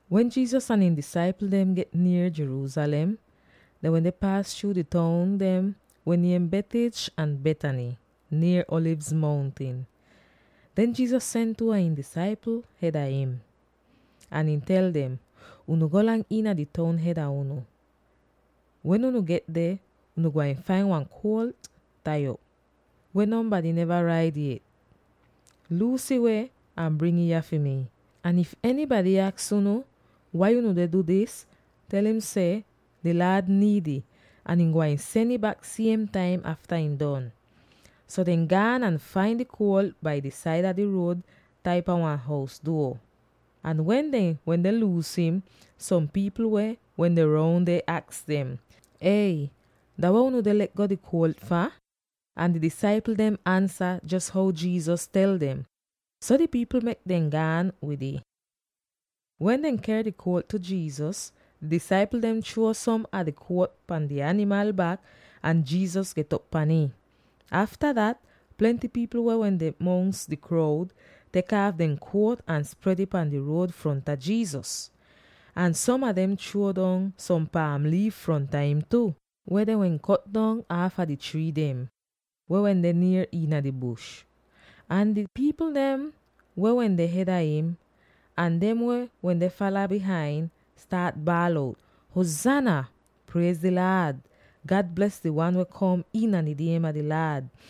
Wen Jesus ahn ihn disaipl dem get nier Jerusalem, dehn wende paas chruu di toun dem weh niem Bethphage ahn Bethany, nier Alivz Mountin. Den Jesus sen two a ihn disaipl hed a im. Ahn ihn tel dem, “Unu golang iina di toun hed a unu. Wen unu get deh, unu gwain fain wan kuolt tai op, weh nonbady neva raid yet. Luus ih weh ahn bring ih yah fi mi. Ahn if enybady aks unu, ‘Wai unu deh du dis?’ tel im seh, ‘Di Laad niid ih, ahn ihn gwain sen ih bak siem taim afta ihn don.’” So dehn gaan ahn fain di kuolt bai di saida di ruod tai pan wan hous duo. Ahn wen dehn wende luus im, som pipl weh wende roun deh aks dem, “Ey! Dah weh unu deh le'go di kuolt fah?” Ahn di disaipl dem ansa jos how Jesus tel dem. So di pipl mek dem gaan wid ih. Wen dehn ker di kuolt tu Jesus, di disaipl dem chruo som a dehn jakit pan di animal bak ahn Jesus get'op pan ih. Afta dat, plenty pipl weh wende mongs di kroud tek aaf dehn jakit ahn spred ih pahn di ruod fronta Jesus. Ahn som a dem chruo dong som paam liif fronta him tu, weh dehn wehn kot dong aafa di trii dem, weh wende nier iina di bush. Ahn di pipl dem weh wende hed a him, ahn dem weh wende fala bihain, staat baal out, “Huzaana! Priez di Laad! God bles di wan weh kom iina di niem a di Laad!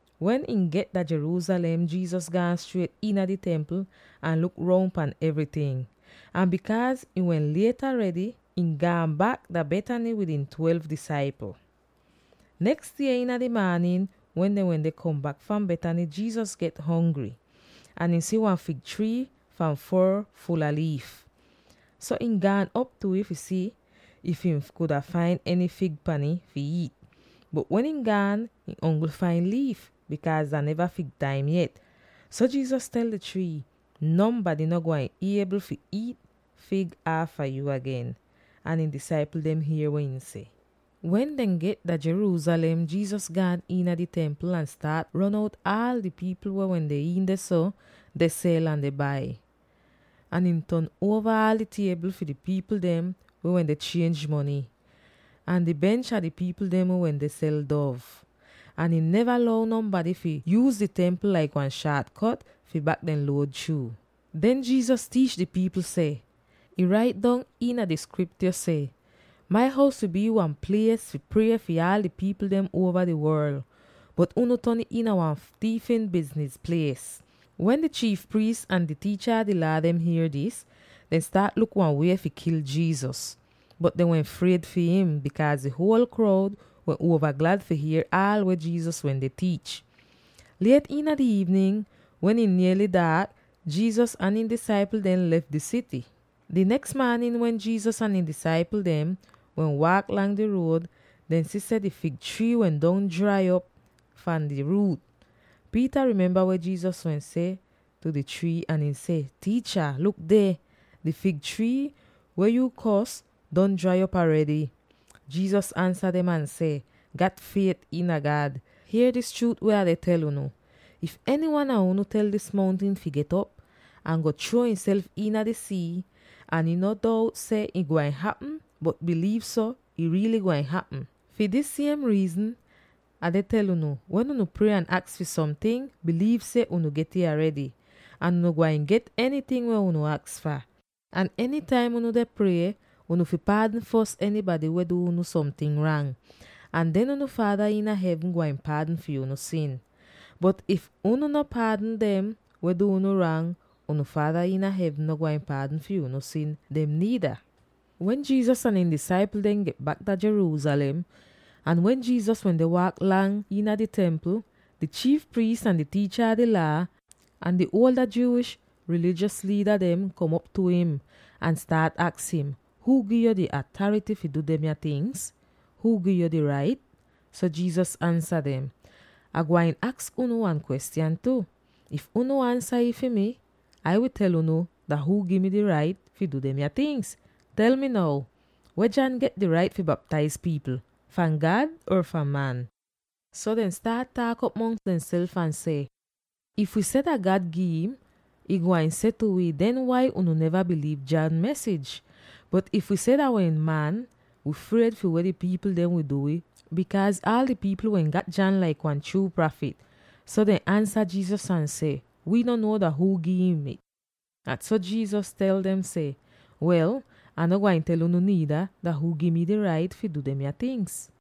Wen ihn get dah Jerusalem, Jesus gaan striet iina di Templ ahn luk roun pan evryting. Ahn, bikaaz ih wehn liet aredy, ihn gaan bak dah Bethany wid ihn twelve disaipl. Neks die iina di maanin wen dehn wende kom bak fahn Bethany, Jesus get hongry. Ahn ihn si wan fig trii fahn foor ful a liif. So ihn gaan op tu ih fi si if ihn kuda fain eny fig pan ih fi iit. Bot wen ihn gaan, ihn ongl fain liif, bikaaz dah neva fig taim yet. So Jesus tel di trii, “Nonbady no gwain iebl fi iit fig aafa yu agen.” Ahn ihn disaipl dem hier weh ihn seh. Wen dehn get dah Jerusalem, Jesus gaan iina di Templ ahn staat ron out aal di pipl weh wende iin dehso, deh sel ahn deh bai. Ahn ihn ton uova aal di tiebl fi di pipl dem weh wende chienj mony, ahn di bench a di pipl dem weh wende sel dov. Ahn ihn neva lou nonbady fi yuuz di Templ laik wan shaat kot fi bak dehn luod chruu. Den Jesus tiich di pipl seh, “Ih rait dong iina di Skriptyo seh, ‘Mai hous fi bii wan plies fi prie fi aal di pipl dem uova di worl,’ bot unu ton ih iina wan tiifin bizniz plies!” Wen di chiif priis ahn di tiicha a di Laa dem hier dis, dehn staat luk wan wie fi kil Jesus. Bot dehn wehn fried fi him, bikaaz di huol kroud wehn uova glad fi hier aal weh Jesus wende tiich. Liet iina di iivnin wen ih niely daak, Jesus ahn ihn disaipl dehn lef di sity. Di neks maanin, wen Jesus ahn ihn disaipl dehn wende waak lang di ruod, dehn si seh di fig trii wehn don drai op fahn di ruut. Peter memba weh Jesus wehn seh tu di trii ahn ihn seh, “Tiicha, luk deh! Di fig trii, weh yu kors, don drai op aredy!” Jesus ansa dem ahn seh, “Gat fiet iina God! Hier dis chruut weh Ah deh tel unu: if enywan a unu tel dis mountin fi get'op ahn go chruo ihself iina di sii, ahn ihn no dout seh ih gwain hapm, bot biliiv so, ih riily gwain hapm. Fi dis siem riizn, Ah deh tel unu: Wen unu prie ahn aks fi somting, biliiv seh unu get'ih aredy, ahn unu gwain get enyting weh unu aks fah. Ahn enytaim unu deh prie, unu fi paadn fos enybady weh du unu somting rang, ahn den unu Faada iina hevn gwain paadn fi unu sin. Bot, if unu no paadn dem weh du unu rang, unu Faada iina hevn no gwain paadn fi unu sin dem niida.” Wen Jesus ahn ihn disaipl dem get bak dah Jerusalem, ahn wen Jesus wende waak lang iina di Templ, di chiif priis, ahn di tiicha a di Laa, ahn di ada Jewish rilijos liida dem kom op tu im, ahn staat aks im, “Huu gi'yo di atarity fi du demya tingz? Huu gi'yo di rait?” So Jesus ansa dem, “Ah gwain aks unu wan kwestyan tu. If unu ansa it fi mi, Ah wi tel unu dah huu gi mi di rait fi du demya tingz. Tel mi now: weh John get di rait fi baptaiz pipl? Fahn God or fahn man?” So dehn staat taak'op mongs demself ahn seh, “If wi seh, ‘Dah God gi'im,’ ihn gwain seh tu wi, ‘Den wai unu neva biliiv John mesij?’ Bot if wi seh, ‘Dah wehn man,’ wi fried fi weh di pipl dem wi du wi, bikaaz aal di pipl dehn wehn gat John laik wan chruu prafit.” So dehn ansa Jesus ahn seh, “Wii no nuo dah huu gi'im it.” So Jesus tel dem seh, “Wel, Ah no gwain tel unu niida dah huu gi mi di rait fi du demya tingz.”